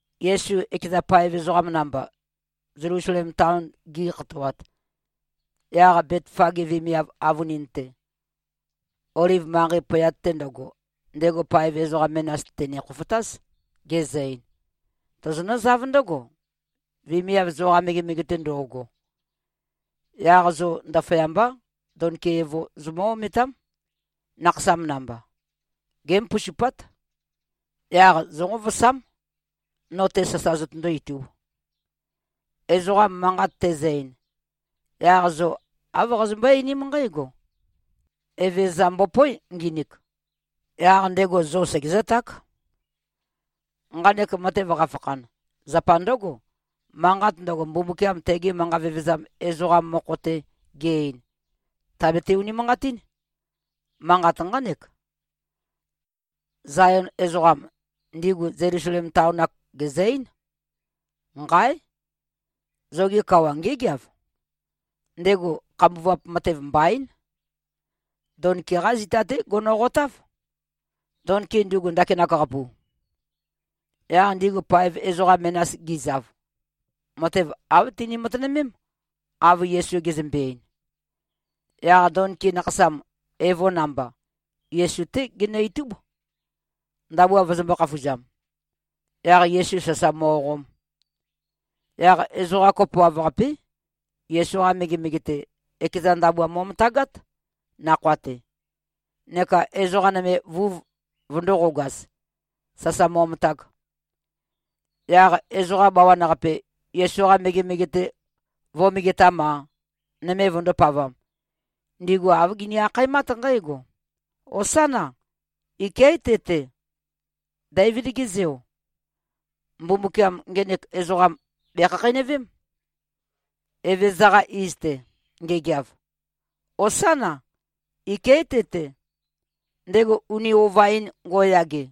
Yesu ekeza paev ezoqam namba, Zelusalem taon gi꞉khatoat, yaq Betfage vemiav avønin-te, Oliv manqei pøyat-te ndøgo, ndego paev ezoqa menas tène-khofotáz, gezø-ein, “Tozonǿzáv ndǿgo, vemiav zoqa megemege-te ndo꞉go. Yaq zo ndaføyambá, donki evo zomǿ-ometám, nakhasam namba. Gémoposupát. Yaq zónqovosám, no-te sasa zotøndó-itūb. Ezoqa manqat tezø-ein, yaq zo āv qazømbøé-einím nqǽgo, ‘Evezøza mbopóe, nginik.’ Yaq ndego zo segezǿták.” Nqanek matev qafakhan, zapa ndǿgo. Manqat ndøgo, Mbumbukiam tege manqa vevezam ezoqam mokho-te ge-ein, tàbete-unimanqatín. Manqat nqánek, Zayon ezoqam, ndigu Zelusalem taon-ak, gèzø-eín, “Nqáe! Zoge kawa ngégeav. Ndego khambuvap matev mbaín. Donki-qá zita-té gonoqotáv, donki ndugu ndakinak-qapu.” Yaq ndigu paev ezoqa menas gizav, matev āv tini-matønømém, av Yesu gezømbe-ein. Yaq donki nakhasam, evo namba, Yesu-té ginø-itúb, ndabua vøzømbō-khafuzam, yaq Yesu sasa mo꞉qom. Yaq ezoqa kopoav-qapé, Yesu-qa megemege-te, ekeza ndabua mo꞉møtagát, nakhoa-te, neka ezoqa nøme vuv vøndōqogaz, sasa mo꞉møtag. Yaq ezoqa bawan-qape, Yesu-qa megemege-te vō꞉megetam-a, nøme vøndōpavam, ndigu āv gini-akhaemát nqǽgo, “Hosána! Iké꞉ te-te, Deivid-ge Zeo! Mbumbukiam ngenek ezoqam bèkhakheinøvém, Evezøza-qa iz-te ngegeav! Hosána! Iké꞉ te-te, ndego uni ova-in ngo꞉yage!”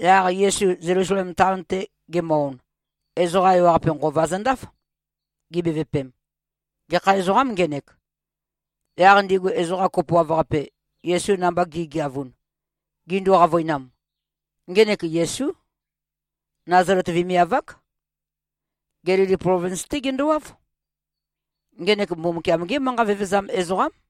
Yaq Yesu Zelusalem taon-te gemø-on, ezoqa ewaqape nqova zøndáf, gibevøpem, “Gekha ezoqâm, ngenek?” Yaq ndigu ezoqa kopoav-qape, Yesu namba gi꞉geavun, gindu-qavøinam, “Ngenek Yesú. Nazalet vemiav-ák. Gelili plovins-té gendowáv. Ngenek Mbumbukiam-gé manqa vevezam ezoqám.”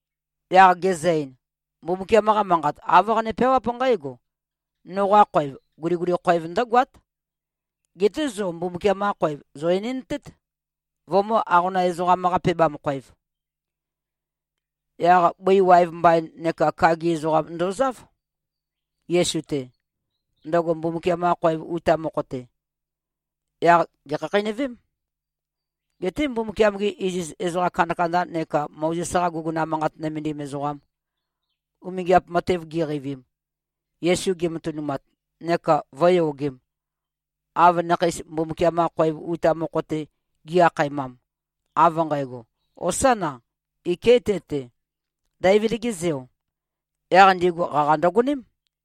Yaq gezø-ein, “Mbumbukiam-qa Manqat, āv qane-peawáp nqǽgo, ‘Noqa khoev, guliguli khoev ndǿgoát.’ Geté zo Mbumbukiam-qa khoev zò-enendtēt, vømǿ-aqonam-ezoqam-qa-pebam-khōev.” Yaq bøi waev mbain neka kagi ezoqam ndozáv, Yesu-te, ndøgo Mbumbukiam-qa khoev uta mokho-te. Yaq gèkhakheinøvém. Geté Mbumbukiam-gi iziz ezoqa kandakanda neka Mozes-qa guguna manqat nømendim ezoqam, umingiap matev giqeivim, Yesu gematønumat neka vø̄yogem, av nakheis Mbumbukiam-qa khoev uta mokho-te gi-akhaemam, av nqægo, “Hosána! Iké꞉ te-te, Deivid-ge Zeo,” yaq ndigu qaqa ndøgoném.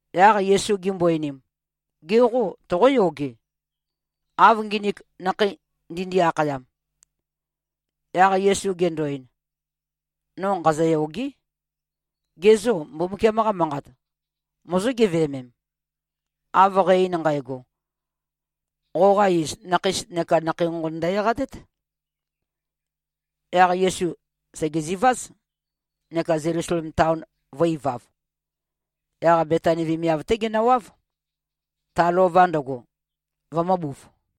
Yaq Yesu gimbo-einim, “Ge qô, toqóyoge, av nginik nakhei ndindi-akhayam?” Yaq Yesu gendo-ein, “No nqazøyôgé. Gê, zo Mbumbukiam-qa Manqat mozó-geveømem, av qæ-ein nqægo? ‘Qoqa iz, nakheis neka nakhei nqonqon ndø-eqatét.’” Yaq Yesu sègeziváz, neka Zelusalem taon vø̄-ivav. Yaq Betani vemiav-té genøwáv, ta lova ndøgo, vømø̄buv.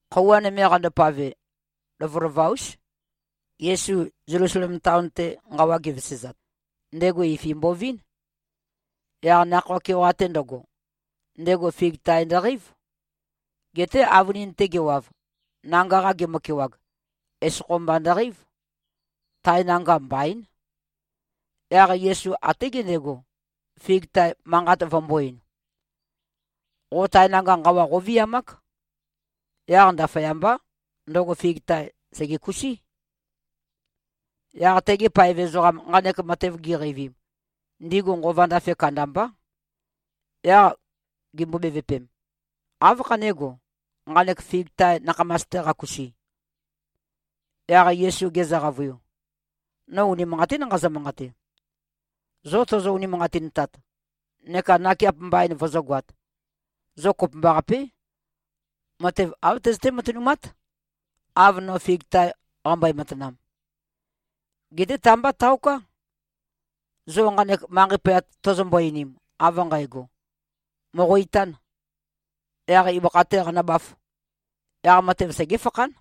Khøuwa nøme qandopave, lovølova-ús, Yesu Zelusalem taon-te nqawa ge꞉vesezat, ndego ifi mbovín. Yaq nakhoa keoqa-te ndøgo, ndego fig tae ndøqeív. Geté avønin-te gewav, nanga-qa gemøkewag, esokho mba ndøqeív. Tae nanga mbaín. Yaq Yesu até gendego, fig tae manqat vømbō-ein, “Qo tae nanga nqawa qóviamák.” Yaq ndaføyambá, ndøgo fig tae sègekusí. Yaq tegi paev ezoqam, nqanek matev giqeivim, ndigu nqova ndafe kandambá. Yaq gimbo-bevøpem, “Áv khanégo, nqanek fig tae nakhamas-te qakusi?” Yaq Yesu gezø-qavøiu, “No unimanqatín nqazø-manqate. Zo tozo-unimanqatintat neka nakeap mbain vozógoāt, zo kopømbaqapé, matev āv tøzøté-matønumát, av no fig tae qambøe-matanam. Geté ta-mbá taoká. Zo nqanek manqei pøyat tozombo-einim, av nqægo, ‘Mòqo-itān. Yaq ibøkha-tē qanøbāf,’ yaq matev segéfakhán.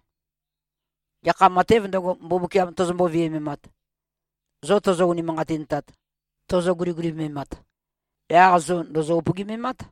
Gekha matēv ndøgo, Mbumbukiam tozombo-viømemat, zo tozo-unimanqatintat, tozo-guligulimemat, yaq zo ndòzo-upøgimemát.”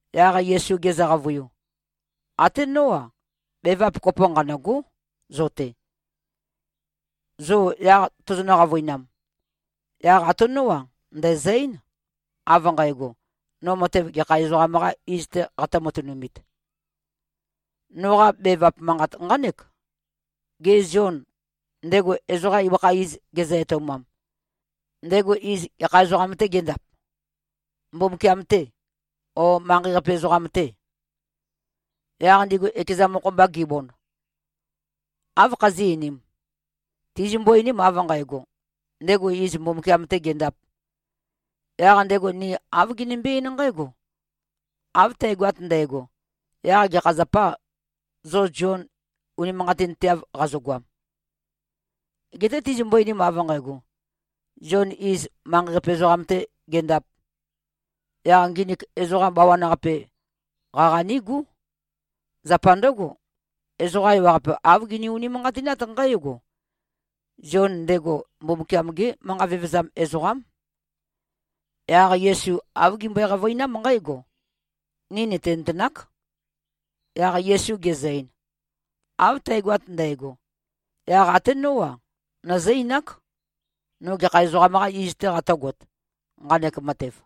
Yaq Yesu gezø-qavøiu, “Até nó-a, bevap kopo nqanø̂gó, zo-te. Zo yaq tozonø-qavøinam, yaq até nó-a, ndæ̀zø-eín, av nqægo, no matev gekha ezoqam-qâ iz-tē qatø̄-matønumit. Noqa bevap manqat nqánek: Gê, Zion, ndego ezoqam ibøkha iz gezø-etoumam, ndego iz gekha ezoqam-tē géndap? Mbumbukiam-tê, ó, manqei-qape ezoqam-tè?” Yaq ndigu ekeza mokho-mba gibond, “Áv khazí꞉-einīm? Tizimbo-einim av nqægo, ‘Ndego iz Mbumbukiam-tē gendāp,’ yaq ndego ni āv ginimbí-eín nqǽgo, ‘Av tægoat ndægo, yaq gekha zapâ, zo Zion unimanqatinteav qazogoam?’ Geté tizimbo-einim av nqægo, ‘Zion, iz, manqei-qape ezoqam-tē gendāp,’ yaq nginik ezoqa bawan-qape, qaqa nígú. Zapa ndǿgo, ezoqa ewaqape āv gini-unimanqatinát nqǽgo: Zion, ndego Mbumbukiam-gé manqa vevezam ezoqám.” Yaq Yesu āv gimbøe-qavøinám nqǽgo, “Ni nìtinøtenák.” Yaq Yesu gezø-ein, “Av tægoat ndægo, yaq até nó-a, nøzǿ-einák, no gekha ezoqam-qā iz-tē qatø̄got, nqanek matev.”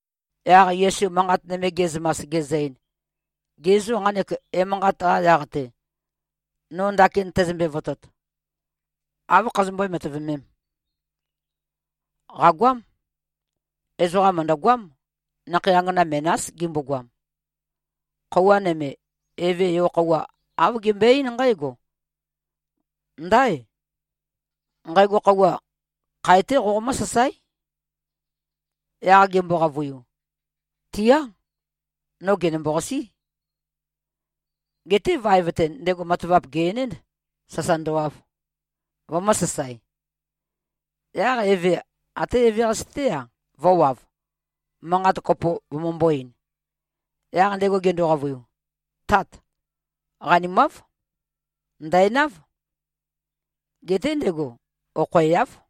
Yaq Yesu manqat nøme ge꞉zømas, gezø-ein, “Ge zô, nqanek emanqat-qa yaq-te, no ndakin tæzømbe-votot, áv khazømbøé-matøvemēm? Qàgoám. Ezoqam mø̀ndøgoám. Nakhei angana menás gimbogoam. Khøuwa nøme, eve, yo-khøuwa, āv gembøe-eín nqǽgo, ‘Ndáe. Nqægo khøuwa, khae-té qomǿsasáe.’ Yaq gembo-qavøiu, ‘Tía. No gènømbo-qasí.’ Geté vaev-te, ndego matavap gè-enénd, sasa ndøwav, vømø̄sasae. Yaq eve, até eveqase-té-a, vø̄wav, manqat kopo vømømbō-ein. Yaq ndego gendo-qavøiu. ‘Tát! Qanimáv. Ndæ̀náv.’ Geté ndego okhoeáv.”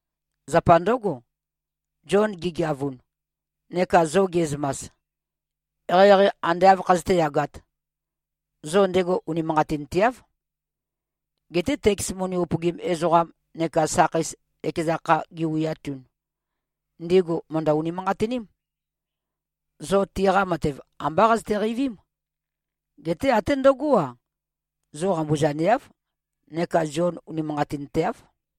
Zapa ndǿgo, Zion gegeavun, neka zo ge꞉zømas, eqeieqei ande āv khazøté-yagāt, zo ndego unimanqatinteáv. Geté teks moni upøgim ezoqam neka sakheis ekeza kha giwiatun, ndigu mø̀ndø-unimanqatiním. Zo tiqa matev ambá qazøte-qeivím. Geté até ndøgó-a, zo qambuzaneáv neka Zion unimanqatinteáv.”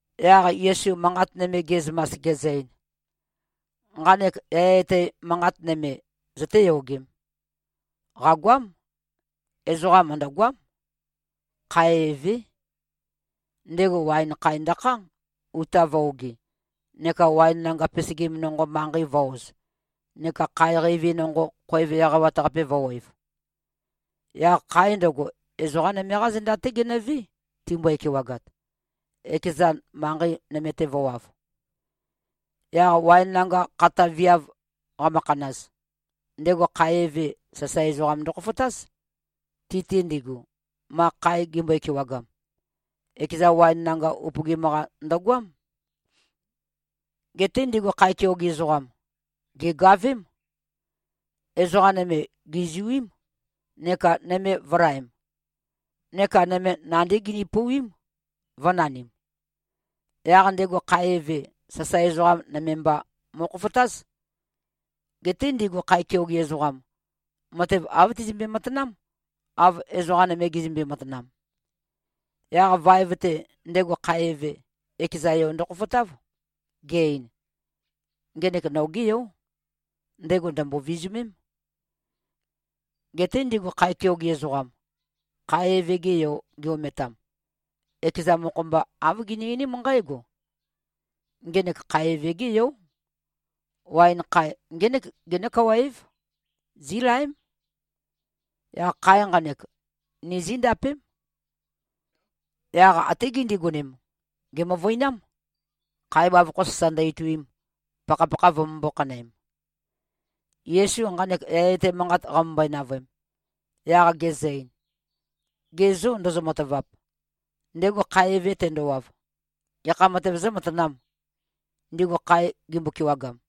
Yaq Yesu manqat nøme ge꞉zømas, gezø-ein, “Nqanek yaya etæ manqat nøme, zøtéyogēm: Qàgoám. Ezoqam mø̀ndøgoám. Khae evé. Ndego waen khae ndøkhá, uta vø̄-ogi, neka waen nanga pesegim nonqo, manqei vø̄-oz, neka khae qeivi nonqo, khoev eqawat-qape vø̄wev. Yaq khae ndøgo, ezoqā nøme-qá zenda-té genøvé, timbøe-kewagat, ekezan manqei nøme-te vø̄wav. Yaq waen nanga khata viav qamøkhanaz, ndego khae eve, sasae ezoqam ndøkhofotáz, ti-te ndigu, ma khae gimbøe-kewagam. Ekeza waen nanga upøgim-qa ndøgoám. Geté ndigu khae keoge ezoqam, gègavém. Ezoqa nøme gèzuím, neka nøme vø̄laem; neka nøme nandí gini-pouwím, vø̄nanim. Yaq ndego khae eve, sasae ezoqa nøme mba mo꞉khofotáz. Geté ndigu khae keoge ezoqam, matev āv tizømbe-matanám, av ezoqa nøme gizømbe-matanam. Yaq vaev-te, ndego khae eve, ekeza yo ndøkhofotáv, ge-ein, ‘Ngenek nogé yó. Ndego ndø̀mbo-vizumém.’ Geté ndigu khae keoge ezoqam, khae eve-ge yo gi-ometam, ekeza mokho-mba, āv gini-einím nqǽgo, ‘Ngenek khae eve-gé yó. Waen khae ngének genó-kawa-év. Zílaém. Yaq khae nqanek, ni zíndapém.’ Yaq até gindigonem, gèmøvøinám, khae bavokho sasa ndø-ituim, pakhapakha vømømbō-khanøem.” Yesu nqanek yaya etæ manqat qamømbøe-navøem, yaq gezø-ein, “Ge zô, ndozo-matavap? Ndego khae eve tendowav, gekha matev zǿmatanām, ndigu khae gimbo-kewagam?”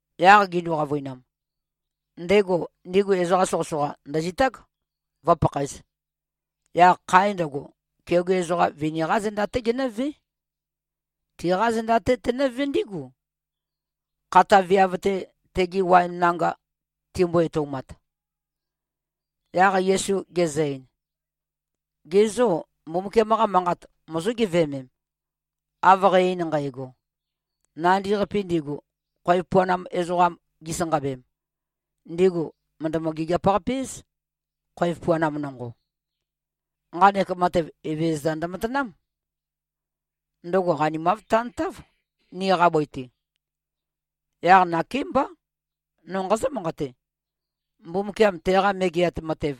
Yaq gindu-qavøinam, “Ndego, ndigu ezoqa soqøsoqa ndø̀zitág, vø̄pakhaez. Yaq khae ndøgo, keoge ezoqa vini-qá zenda-té genǿvé. Tiqá zenda-té tenǿvé ndígu, khata viav-te, tegi waen nanga timbo-etoumat.” Yaq Yesu gezø-ein, “Ge zô, Mbumbukiam-qa Manqat mozó-geveømem, av qæ-ein nqægo? ‘Nandi-qapi ndigu, khoev puanam ezoqam gisanqabem, ndigu mø̀ndømø-gigiap-qape-éz, khoev puanam nonqo. Nqanek matev, Evezøza ndømatanám. Ndøgo qanimav tantáv, niqa bøi-te.’ Yaq nakémbá, no nqazǿ-manqate: Mbumbukiam teqa Megeat Matev,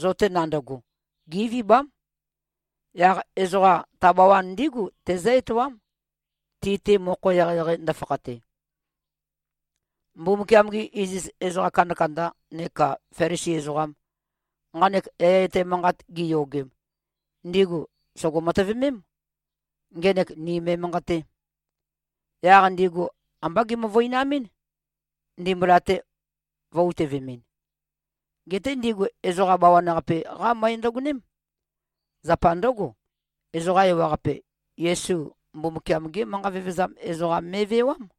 zo-te nandøgo, gévibám. Yaq ezoqa ta bawan ndígu tezǿ-etoám, ti-te mokho eqeieqei ndøfakhate.” Mbumbukiam-gi iziz ezoqa kandakanda neka Felisi ezoqam, nqanek yaya etæ manqat giyogem, ndigu sògo-matøvemém, ngenek ni me꞉manqatē. Yaq ndigu ambá gimøvøinamɨ́n, ndimbula-te vø̄-utøvemɨn. Geté ndigu ezoqa bawan-qape-qá møe ndøgoném. Zapa ndǿgo, ezoqa ewaqape, Yesu Mbumbukiam-gé manqa vevezam ezoqam me꞉vewám.